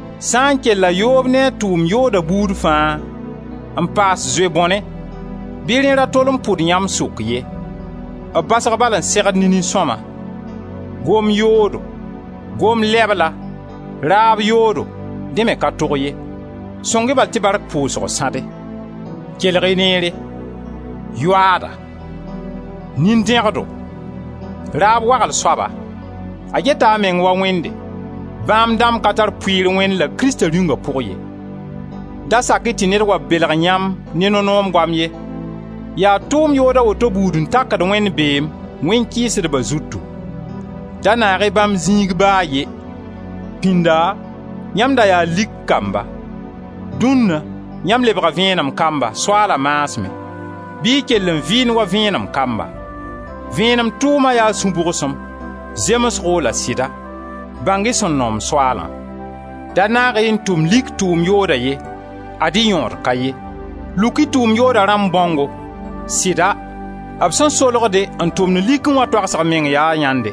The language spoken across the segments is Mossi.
Sã n kella yoob ne a tʋʋm yooda buud fãa, n paas zoe-bõne, bɩ rẽ ra tol n pʋd yãmb sʋk ye: b basg bala n segd ne nin-sõma. Gom-yoodo, gom-lɛbla, raab yoodo, dẽ me ka tog ye. Sõng-y bal tɩ bark pʋʋsg sãde. Kelg-y neere: yoaada, nin-dẽgdo, raab wagl soaba, — a geta a meng wa wẽnde — bãmb dãmb ka tar pʋɩɩr Wẽnd la Krista Rĩunga pʋg ye. Da sak-y tɩ ned wa belg yãmb ne no-noom goam ye, yaa tʋʋm yood a woto buud n takd Wẽnd beem, wẽn-kɩɩsdba zutu. Da naag-y bãmb zĩig ba a ye! Pinda yãmb da yaa lik kamba, dũnna yãmb lebga vẽenem kamba, Soaala maasmẽ, bɩ y kell n vɩɩnd wa vẽenem kamba. Vẽenem tʋʋma yaa sũ-bʋgsem, zemsgo la sɩda, Bãng-y sẽn noom Soaalã. Da naag-y n tʋm lik tʋʋm yooda ye, ad-y yõod ka ye. Luk-y tʋʋm yooda rãmb bãongo. Sɩda, b sẽn solgde n tʋmd likẽ wã toagsg meng yaa yãnde,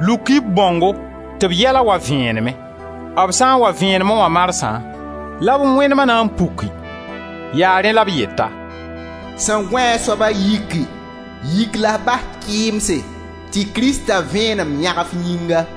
Luk-y b bãongo tɩ b yɛla wa vẽenemẽ. B sã n wa vẽenemẽ wã marsã la b wẽnema na n puki. Yaa rẽ la b yeta: «Sẽn gõe soaba yiki, yik la f bas kɩɩmse tɩ Krista Vẽenem yãg f yĩnga.»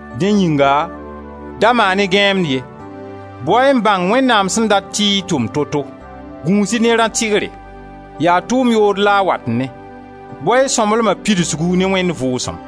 Dẽ yĩnga da maan-y gãeemd ye; bao-y n bãng Wẽnnaam sẽn dat tɩ y tʋm toto. Gũus-y ne rã-tɩgre: yaa tʋʋm yood la-a wat ne. Bao-y y sõmblema pidsgu ne Wẽnd Vʋʋsem.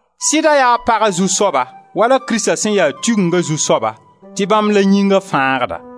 Sɩda yaa paga zu-soaba wala Krista sẽn ya Tigenga zu-soaba tɩ bãmb la Yĩnga fãagda.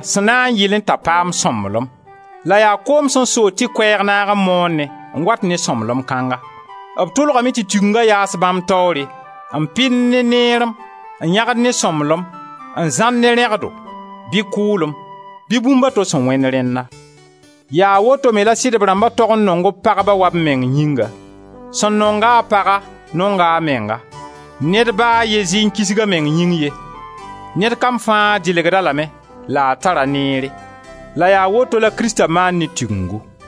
sẽn na n yɩlẽ t'a paam sõmblem; la yaa koom sẽn sood tɩ Koɛɛg naag n moonẽ n wat ne sõmblem kãnga. B tʋlgame tɩ Tigenga yaas bãmb taoore, n pɩnd ne neerem, n yãgd ne sõmblem, n zãr ne rẽgdo, bɩ kʋʋlem, bɩ bũmb a to sẽn wẽnd rẽnna. Yaa woto me la sɩdb rãmba tog n nong b pagba wa b meng yĩnga; sẽn nong-a a paga nonga a menga. Ned ba a ye zɩ n kisg a meng yĩng ye. Ned kam fãa dɩlgd-a lame la a tar-a neere. La yaa woto la Krista maand ne Tigengu.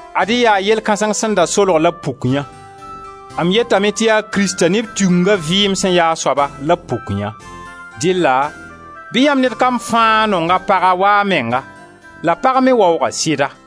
Ad-y yaa yell kãseng sẽn da solg la b pukyã: M yetame tɩ yaa Krista ne b Tigenga vɩɩm sẽn ya a soaba la b pukyã. Dɩlla bɩ yãmb ned kam fãa nong a paga wa a menga la pag me waoog a sɩda.